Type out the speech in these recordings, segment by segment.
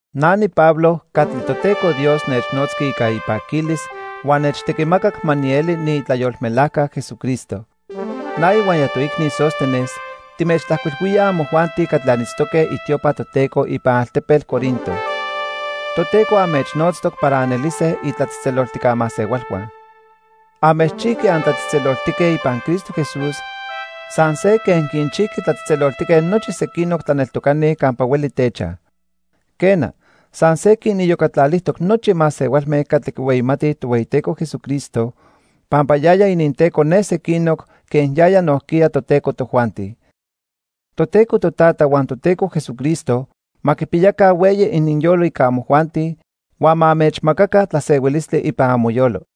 Na niPablo catli Toteco Dios nechnotzqui ica ipaquilis huan nechtequimacac ma nieli niitlayolmelajca Jesucristo. Na ihuaya toicni Sóstenes timechtlajcuilhuíaj amojuanti catli anitztoque itiopa Toteco ipan altepetl Corinto. Toteco anmechnotztoc para anelise itlatzejtzeloltijca masehualhua. Anmechchijqui antlatzejtzeloltique ipan Cristo Jesús san se quen quinchijqui tlatzejtzeloltique nochi sequinoc tlaneltocani campa hueli techaj. Quena, san se quiniyocatlalijtoc nochi masehualme catli quihueyimatij Tohueyiteco Jesucristo, pampa yaya ininTeco ne sequinoc quen yaya nojquiya toTeco tojuanti. Toteco Totata huan Toteco Jesucristo ma quipiyaca hueyi ininyolo ica amojuanti huan ma anmechmacaca tlasehuilistli ipan amoyolo.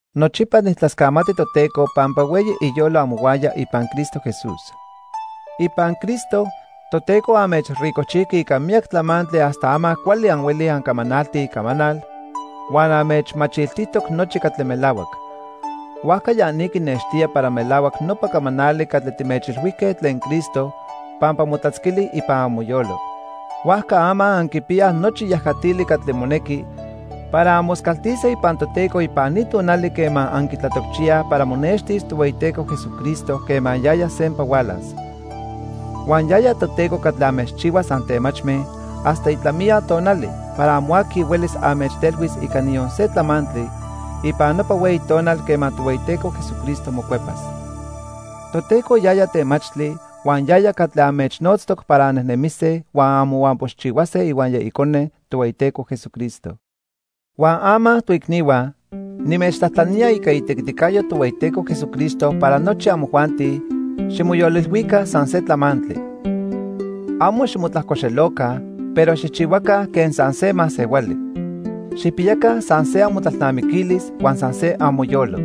Nochipa nijtlascamati Toteco pampa hueyi iyolo amohuaya ipan Cristo Jesús. Ipan Cristo, Toteco anmechricojchijqui ica miyac tlamantli hasta ama cuali anhuelij ancamanaltij icamanal huan anmechmachiltijtoc nochi catli melahuac. Huajca ya ni quinextía para melahuac nopa camanali catli timechilhuijque tlen Cristo pampa motlatzquili ipan amoyolo. Huajca ama anquipiyaj nochi yajatili catli monequi para anmoscaltise ipan Toteco ipan ni tonali quema anquitlatocchiyaj para monextis Tohueyiteco Jesucristo quema yaya sempa hualas. Huan yaya Toteco catli anmechchihuas antemachme hasta itlamiya tonali para amo aqui huelis anmechtelhuis ica niyon se tlamantli ipan nopa hueyi tonal quema Tohueyiteco Jesucristo mocuepas. Toteco yaya temachtli huan yaya catli anmechnotztoc para annejnemise huan anmohuampoxchihuase ihuaya Icone, Tohueyiteco Jesucristo. Huan ama, toicnihua, nimechtlajtlanía ica itequiticayo Tohueyiteco Jesucristo para nochi amojuanti ximoyolilhuica san se tlamantli. Amo ximotlajcoxeloca, pero xijchihuaca quen san se masehuali. Xijpiyaca san se amotlalnamiquilis huan san se amoyolo.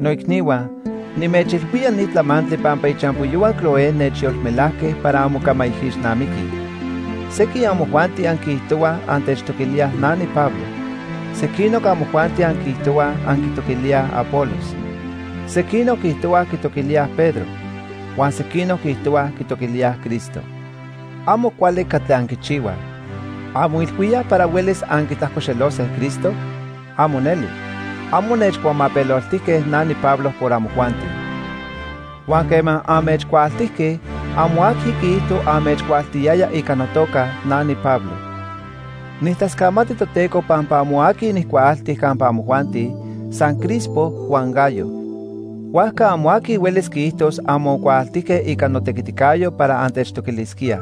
Noicnihua, nimechilhuía ni tlamantli pampa ichampoyohua Cloé nechyolmelajque para anmocamaijixnamiquij. Sequin amojuanti anquiijtohuaj antechtoquilíaj na niPablo. Sequinoc amojuanti anquiijtohuaj anquitoquilíaj Apolos. Sequinoc quiijtohuaj quitoquilíaj Pedro. Huan sequinoc quiijtohuaj quitoquilíaj Cristo. Amo cuali catli anquichihuaj. ¿Anmoilhuíaj para huelis anquitlajcoxelose Cristo? ¡Amo neli! Amo nechcuamapeloltijque na niPablo por amojuanti. Huan quema anmechcuaaltijque, amo aqui quiijto anmechcuaaltiyaya ica notoca na niPablo. Nijtlascamati Toteco pampa amo aqui nijcuaalti campa amojuanti, san Crispo huan Gayo. Huajca amo aqui huelis quiijtos anmocuaaltijque ica notequiticayo para antechtoquilisquíaj.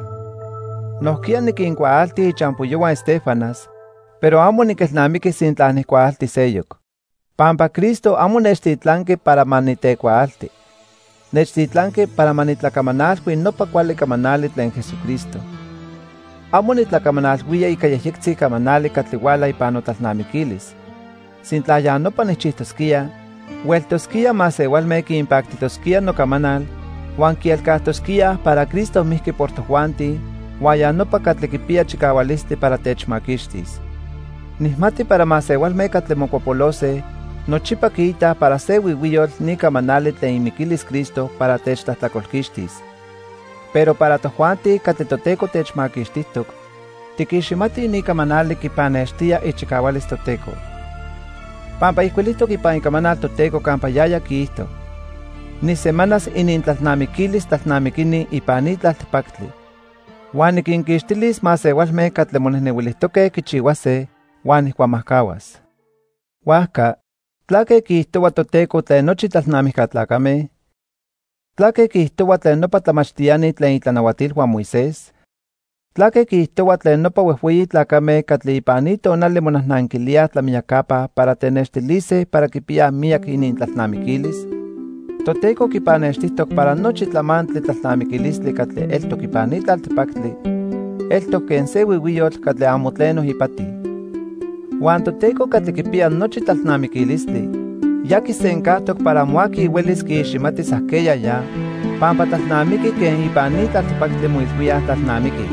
Nojquiya niquincuaalti ichampoyohua Estéfanas, pero amo niquelnamiqui sintla nijcuaalti seyoc. Pampa Cristo amo nechtitlanqui para ma nitecuaalti. Nechtitlanqui para ma nitlacamanalhui nopa cuali camanali tlen Jesucristo. Amo nitlacamanalhuía ica yejyectzi camanali catli huala ipan notlalnamiquilis. Sintla ya nopa nijchijtosquía, hueltosquía masehualme quinpactijtosquía nocamanal huan quielcajtosquíaj para Cristo mijqui por tojuanti huan ya nopa catli quipiya chicahualistli para techmaquixtis. Nijmati para masehualme catli mocuapolose nochipa quiitaj para se huihuiyotl ni camanali tlen imiquilis Cristo para techtlajtlacolquixtis. Pero para tojuanti catli Toteco techmaquixtijtoc, tiquiximatij ni camanali quipannextía ichicahualis Toteco. Pampa ijcuilijtoc ipan Icamanal Toteco campa yaya quiijto: "Nijsemanas inintlalnamiquilis tlalnamiquini ipan ni tlaltipactli. Huan niquinquixtilis masehualme catli monejnehuilijtoque quichihuase, huan nijcuamajcahuas." Huajca ¿tlaque quiijtohua Toteco tlen nochi tlalnamijca tlacame? ¿Tlaque quiijtohua tlen nopa tlamachtiani tlen itlanahuatilhua Moisés? ¿Tlaque quiijtohua tlen nopa huejhueyi tlacame catli ipan ni tonali monajnanquilíaj tlamiyacapa para tenextilise para quipiyaj miyac inintlalnamiquilis? Toteco quipannextijtoc para nochi tlamantli tlalnamiquilistli catli eltoc ipan ni tlaltipactli eltoc quen se huihuiyotl catli amo tleno ipati. Huan Toteco catli quipiya nochi tlalnamiquilistli ya quisencajtoc para amo aqui huelis quiiximatis ajqueya ya pampa tlalnamiqui quen ipan ni tlaltipactli moilhuíaj tlalnamiquij.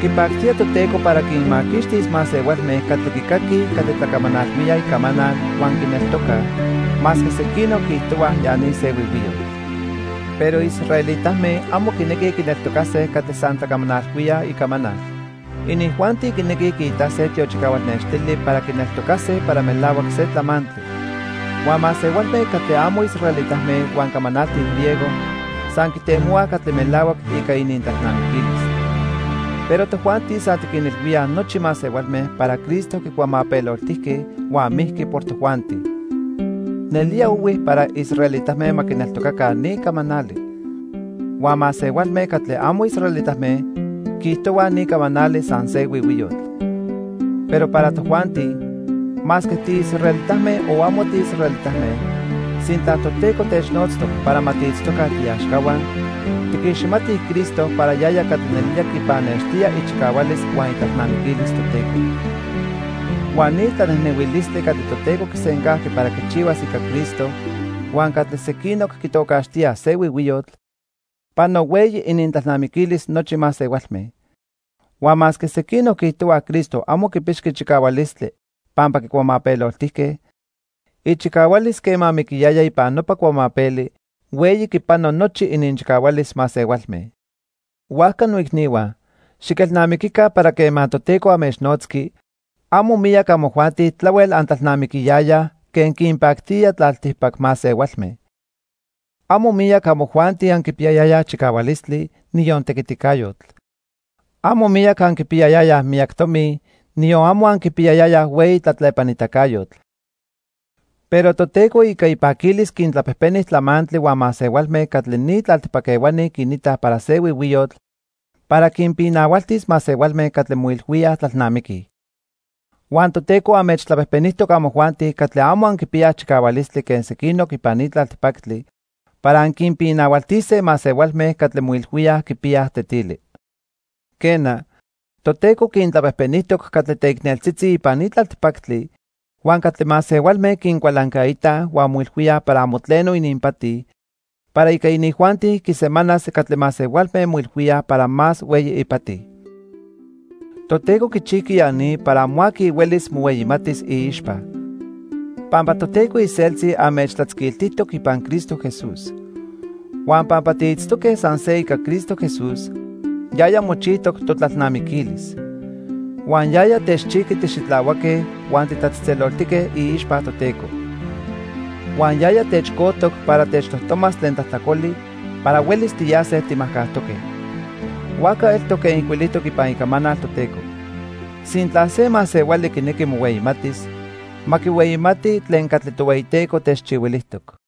Quipactía Toteco para quinmaquixtis masehualme catli quicaquij catli tlacamanalhuíaj icamanal huan quineltocaj, masque sequinoc quiijtohuaj ya ni se huihuiyotl. Pero israelitame amo quinequij quineltocase catli san tlacamanalhuíaj icamanal. Inijuanti quinequij quiitase tiochicahual nextili para quineltocase para melahuac se tlamantli. Huan masehualme catli amo israelitame huan camanaltij griego san quitemohuaj catli melahuac ica inintlalnamiquilis. Pero tojuanti san tiquinilhuíaj nochi masehualme para Cristo quicuamapeloltijque huan mijqui por tojuanti. Nelía ohui para israelitame ma quineltocaca ni camanali. Huan masehualme catli amo israelitame quiijtohuaj ni camanali san se huihuiyotl. Pero para tojuanti, masque tiisraelitame o amo tiisraelitame, sintla Toteco technotztoc para ma tiitztoca tiiaxcahua, tiquiximatij Cristo para yaya catli nelía quipannextía ichicahualis huan itlalnamiquilis Toteco. Huan ni tlanejnehuilistli catli Toteco quisencajqui para quichihuas ica Cristo huan catli sequinoc quitocaxtíaj se huihuiyotl, pano hueyi inintlalnamiquilis nochi masehualme. Huan masque sequinoc quiijtohuaj Cristo amo quipixqui chicahualistli pampa quicuamapeloltijque, ichicahualis quema miquiyaya ipan nopa cuamapeli hueyi quipano nochi ininchicahualis masehualme. Huajca noicnihua, xiquelnamiquica para quema Toteco anmechnotzqui, amo miyac amojuanti tlahuel antlalnamiquiyayaj quen quinpactía tlaltipac masehualme. Amo miyac amojuanti anquipiyayayaj chicahualistli, niyon tequiticayotl. Amo miyac anquipiyayayaj miyac tomi, niyon amo anquipiyayayaj hueyi tlatlepanitacayotl. Pero Toteco ica ipaquilis quintlapejpeni tlamantli huan masehualme catli ni tlaltipac ehuani quinitaj para se huihuiyotl para quinpinahualtis masehualme catli moilhuíaj tlalnamiquij. Huan Toteco anmechtlapejpenijtoc amojuanti catli amo anquipiyaj chicahualistli quen sequinoc ipan ni tlaltipactli, para anquinpinahualtise masehualme catli moilhuíaj quipiyaj tetili. Quena, Toteco quintlapejpenijtoc catli teicneltzitzi ipan ni tlaltipactli huan catli masehualme quincualancaitaj huan moilhuíaj para amo tleno ininpati para ica inijuanti quisemanas catli masehualme moilhuíaj para más hueyi ipati. Toteco quichijqui ya ni para amo aqui huelis mohueyimatis iixpa. Pampa Toteco iseltzi anmechtlatzquiltijtoc ipan Cristo Jesús. Huan pampa tiitztoque san se ica Cristo Jesús, yaya mochijtoc totlalnamiquilis. Huan yaya techchijqui tixitlahuaque huan titlatzejtzeloltique iixpa Toteco. Huan yaya techcojtoc para techtojtomas tlen tlajtlacoli para huelis tiyase timajcajtoque. Huajca eltoc quen ijcuilijtoc ipan Icamanal Toteco: "Sintla se masehuali quinequi mohueyimatis, ma quihueyimati tlen catli Tohueyiteco techchihuilijtoc."